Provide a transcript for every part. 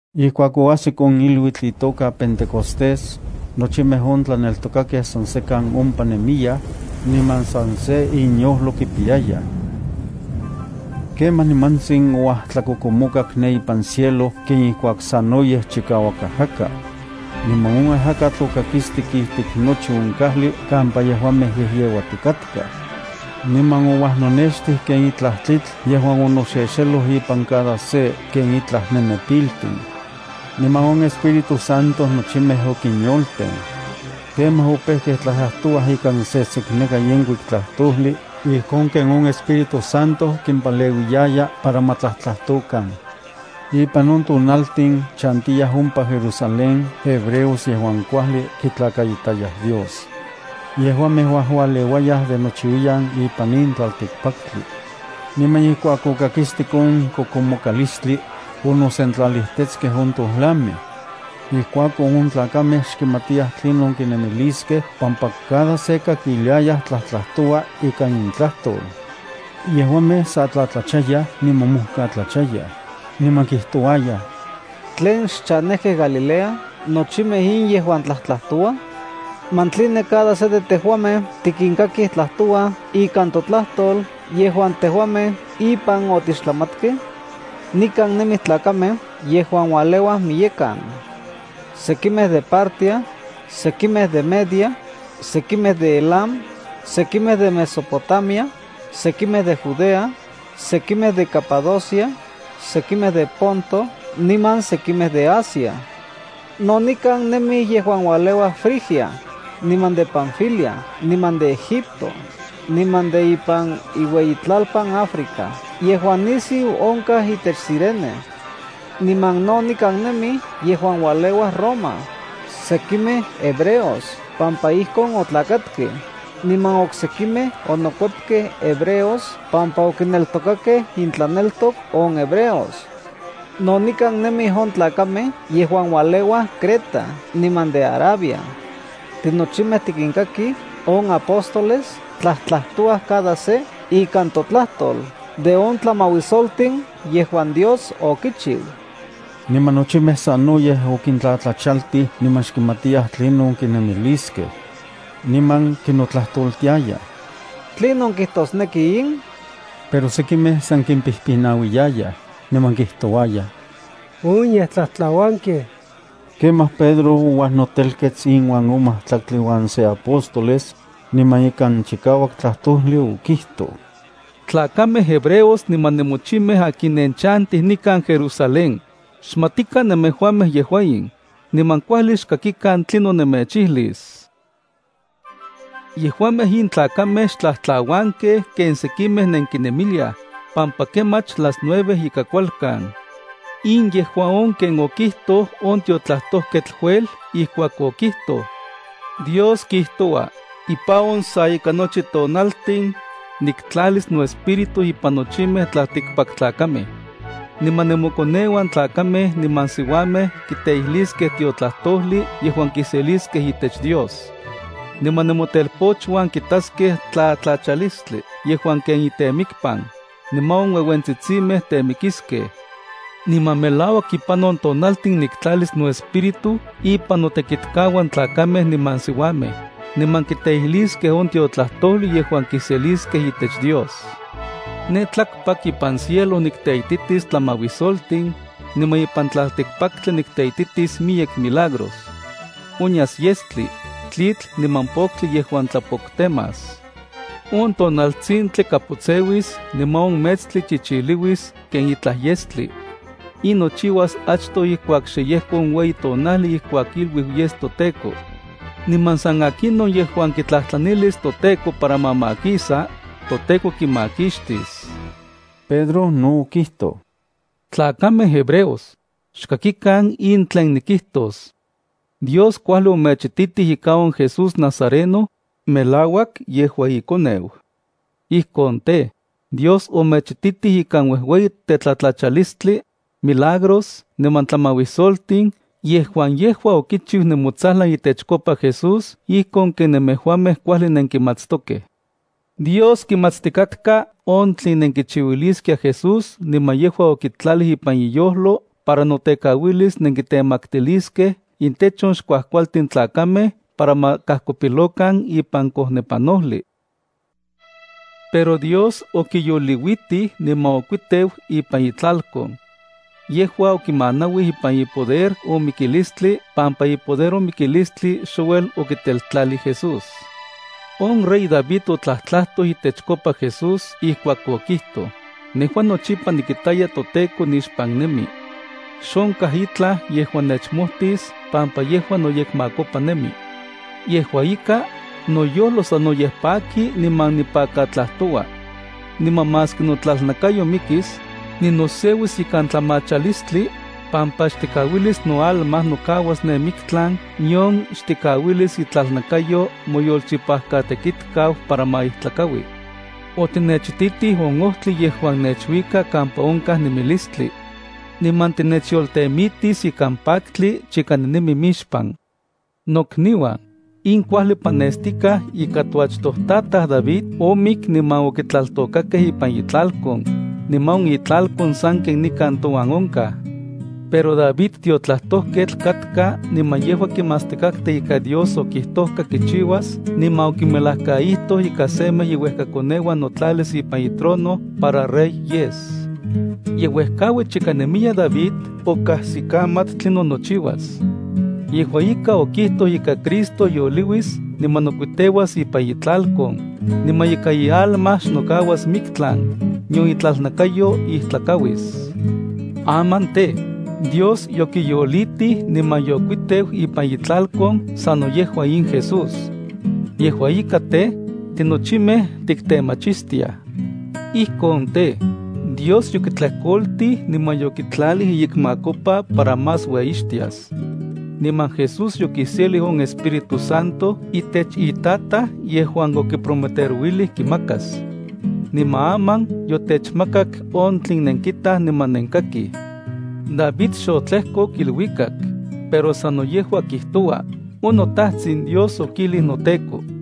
Ijkuak oajsik on iluitl itoka Pentecostés, nochimej on tlaneltokakej san sekan ompa nemiyaj, niman san se inyojlo kipiyayaj. Kemaj nimantsin ouajtlakokomokak ne ipan cielo ken ijkuak sanoyej chikauak ajaka. Niman on ajakatl okakistik ijtik nochi on kajli kampa yejuamej yejyeuatikatkaj. Niman ouajnonextij ken itlaj tlitl yejuan onoxexeloj impan cada se ken itlan nenepiltin. Niman on Espíritu Santo nochimej okinyolten. Kemaj opejkej tlajtlajtouaj ikan sesekneka yenkuik tlajtojli ijkon ken on Espíritu Santo kimpaleuiyaya para ma tlajtlajtokan. Ipan on tonaltin chantiyaj ompa Jerusalén hebreos yejuan kuajli kitlakaitayaj Dios. Yejuamej uajualeuayaj de nochiuiyan ipan in tlaltikpaktli. Niman ijkuak okakistik on kokomokalistli, onosentlalijtetskej on tojlamej. Ijkuakon on tlakamej xkimatiyaj tlinon kinemiliskej pampa cada se kakiliayaj tlajtlajtoua ikan intlajtol. Yejuamej sa tlatlachayaj niman mojkatlachayaj. Niman kijtouayaj: —¿Tlen xchanejkej Galilea nochimej in yejuan tlajtlajtouaj? ¿Man tline cada se de tejuamej tikinkakij tlajtouaj ikan totlajtol yejuan tejuamej ipan otixtlamatkej? Nikan nemij tlakamej yejuan ualeuaj miyekan. Sekimej de Partia, sekimej de Media, sekimej de Elam, sekimej de Mesopotamia, sekimej de Judea, sekimej de Capadocia, sekimej de Ponto niman sekimej de Asia. No nikan nemij yejuan ualeuaj Frigia, niman de Panfilia niman de Egipto, niman de ipan iueyitlalpan Africa yejuan nisiu onkaj itech Cirene. Niman no nikan nemij yejuan ualeuaj Roma, sekimej hebreos pampa ijkon otlakatkej, niman oksekimej onokuepkej hebreos pampa okineltokakej intlaneltok on hebreos. No nikan nemij on tlakamej yejuan ualeuaj Creta niman de Arabia. Tinochimej tikinkakij on apóstoles tlajtlajtouaj cada se ikan totlajtol de on tlamauisoltin yejuan Dios okichiu. Niman nochimej sanoyej okintlatlachaltij niman xkimatiyaj tlinon kinemiliskej. Niman kinotlajtoltiayaj: —¿Tlinon kijtosneki in? Pero sekimej san kimpijpinauiyayaj, niman kijtouayaj: —On yej tlajtlauankej. Kemaj Pedro ouajnotelkets inuan on majtlaktli uan se apóstoles, niman ikan chikauak tlajtojli, okijtoj: —Tlakamej hebreos niman nemochimej akin nenchantij nikan Jerusalén, xmatikan nemejuamej yejua in, niman kuajli xkakikan tlinon nemechijlis. Yejuamej in tlakamej xtlajtlauankej ken sekimej nenkinemiliaj, pampa kemach las nueve ika kualkan ijkuak chiknaui hora. In yejua on ken okijtoj on tiotlajtojketl Joel ijkuak okijtoj: Dios kijtoua: “Ipan on sa ika nochi tonaltin, niktlalis noEspíritu ipan nochimej tlaltikpaktlakamej. Niman nemokoneuan tlakamej niman siuamej, kiteijliskej tiotlajtojli yejuan kiseliskej itech Dios. Niman nemotelpochuan kitaskej tlatlachalistli yejuan ken intemikpan, niman on ueuentsitsinmej temikiskej. Niman melauak ipan on tonaltin niktlalis noEspíritu ipan notekitkauan tlakamej niman siuamej, niman kiteijliskej on tiotlajtojli yejuan kiseliskej itech Dios. Ne tlakpak ipan cielo nikteititis tlamauisoltin, niman ipan tlaltikpaktli nikteititis miyek milagros. Onyas yestli, tlitl niman poktli yejuan tlapoktemas. On tonaltsintli kapotseuis, niman on metstli chichiliuis ken itlaj yestli. In nochiuas achtoj ijkuak xe yejko on ueyi tonajli ijkuak iluiu yes toTEKO. Niman san akinon yejuan kitlajtlanilis toTEKO para ma makisa, toTEKO kimakixtis.” Pedro no okijtoj: —Tlakamej hebreos, xkakikan in tlen nikijtos. Dios kuajli omechititij ika on Jesús Nazareno, melauak yejua iKoneu. Ijkon tej, Dios omechititij ikan uejueyi tetlatlachalistli, milagros niman tlamauisoltin yejuan yejua okichiu nemotsajlan itechkopa Jesús ijkon ken nemejuamej kuajli nenkimatstokej. Dios kimatstikatka on tlen nenkichiuiliskiaj Jesús niman yejua okitlalij ipan iyojlo para notekauilis nenkitemaktiliskej intech on xkuajkualtin tlakamej para ma kajkopilokan ipan kojnepanojli. Pero Dios okiyoliuitij niman okuiteu ipan itlalkon. Yejua okimanauij ipan ipoder on mikilistli pampa ipoder on mikilistli xouel okiteltlalij Jesús. On rey David otlajtlajtoj itechkopa Jesús, ijkuak okijtoj: Nejua nochipa nikitaya toTEKO nixpan nemi. Xonkaj itlaj yejuan nechmojtis pampa yejua noyekmakopa nemi. Yejua ika, noyojlo sanoyej paki niman nipakatlajtoua. Niman maski notlalnakayo mikis, ninoseuis ikan tlamachalistli, pampa xtikauilis noalma nokauas ne miktlan, nion xtikauilis itlalnakayo moyolchipajkatekitkau para ma ijtlakaui. Otinechititij on ojtli yejuan nechuika kampa onkaj nemilistli. Niman tinechyoltemitis ikan paktli chika ninemi mixpan. ’Nokniuan, in kuajli panestikaj ika toachtojtataj David omik niman okitlaltokakej ipan itlalkon, niman on itlalkon sanken nikan touan onkaj. Pero David tiotlajtojketl katka niman yejua kimatstikatka ika Dios okijtojka kichiuas niman okimelajkaijtoj ika semej iuejkakoneuan notlalis ipan itrono para rey yes. Ye uejkaui chika nemiya David okajsikamat tlinon nochiuas. Yejua ika otlajtoj ika Cristo yoliuis niman nokuiteuas ipan itlalkon, niman ika ialma xnokauas miktlan, nion itlalnakayo ijtlakauis. Aman tej, Dios yokiyolitij niman yokuiteu ipan itlalkon sano yejua in Jesús. Yejua ika tej, tinochimej tiktemachistiaj. Ijkon tej, Dios yokitlejkoltij yokitlalij iyekmakopa para más ueyixtias. Niman Jesús yokiselij on Espíritu Santo itech iTataj yejuan okiprometerouilij kimakas. Niman aman yotechmakak on tlen nenkitaj niman nenkakij. David xotlejkok iluikak, pero sano yejua kijtoua: On noTajtsin Dios okijlij noTEKO: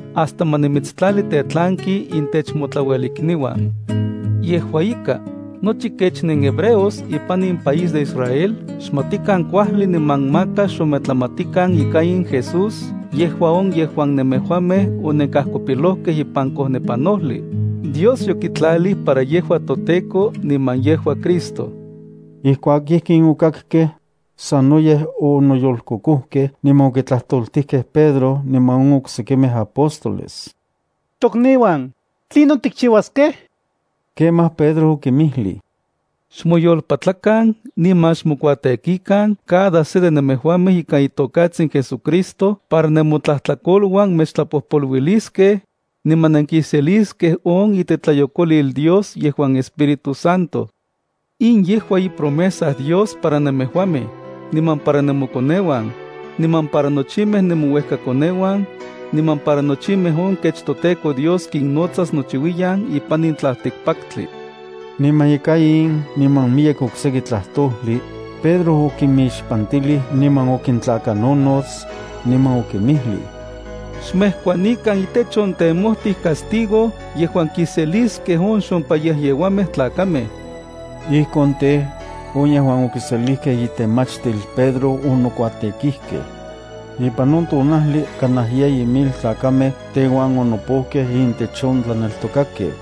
hasta ma nimitstlali tetlanki intech motlauelikniuan.” ’Yejua ika, nochi kech nenhebreos ipan in país de Israel xmatikan kuajli niman maka xometlamatikan ika in Jesús yejua on yejuan nemejuamej onenkajkopilojkej ipan kojnepanojli, Dios yokitlalij para yejua toTEKO niman yejua Cristo. Ijkuak ijkin okakkej, sanoyej onoyolkokojkej niman okitlajtoltijkej Pedro niman on oksekimej apóstoles: —Tokniuan, ¿tlinon tikchiuaskej? Kemaj Pedro okinmijlij: —Xmoyolpatlakan niman xmokuatekikan cada se de nemejuamej ikan itokatsin JesuCristo para nemotlajtlakoluan mechtlapojpoluiliskej, niman nenkiseliskej on itetlayokolil Dios yejuan Espíritu Santo. In yejua ipromesa Dios para nemejuamej, niman para nemokoneuan, niman para nochimej nemouejkakoneuan, niman para nochimej on kech toTEKO Dios kinnotsas nochiuiyan ipan in tlaltikpatli. Niman ika in niman miyek okseki tlajtojli, Pedro okinmixpantijli niman okintlakanojnots, niman okinmijlij: —Xmejkuanikan itech on temojtij castigo yejuan kiseliskej on xompayejyeuamej tlakamej. Ijkon tej, on yejuan okiselijkej itemachtil Pedro onokuatekijkej. Ipan on tonajli kanaj yeyi mil tlakamej teuan onopojkej intech on tlaneltokakej.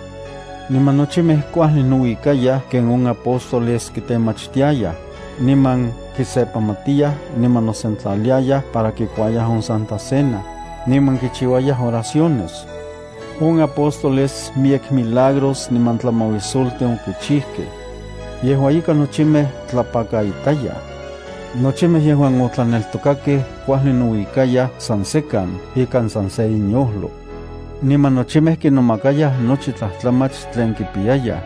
Niman nochimej kuajli nouikayaj ken on apóstoles kitemachtiayaj, niman kisepamatiyaj niman nosentlaliayaj para kikuayaj on Santa Cena, niman kichiuayaj oraciones. On apóstoles miyek milagros niman tlamauisoltin okichijkej. Yejua ika nochimej tlapakaitayaj. Nochimej yejuan otlaneltokakej kuajli nouikayaj san sekan ikan san se inyojlo. Niman nochimej kinomakayaj nochi tlajtlamach tlen kipiyayaj.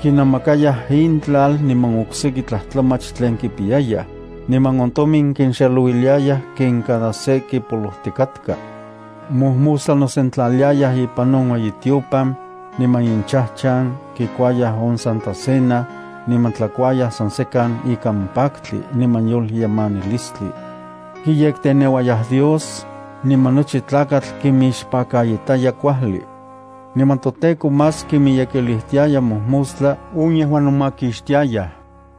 Kinamakayaj intlal niman okseki tlajtlamach tlen kipiyayaj, niman on tomin kinxelouiliayaj ken cada se kipolojtikatka. Mojmostla nosentlaliayaj ipan on ueyitiopan, niman inchajchan kikuayaj on Santa Cena, niman tlakuayaj san sekan ikan paktli niman yolyemanilistli. Kiyekteneuayaj Dios, niman nochi tlakatl kinmixpakaitaya kuajli. Niman toTEKO más kinmiyekilijtiaya mojmostla on yejuan nomakixtiayaj.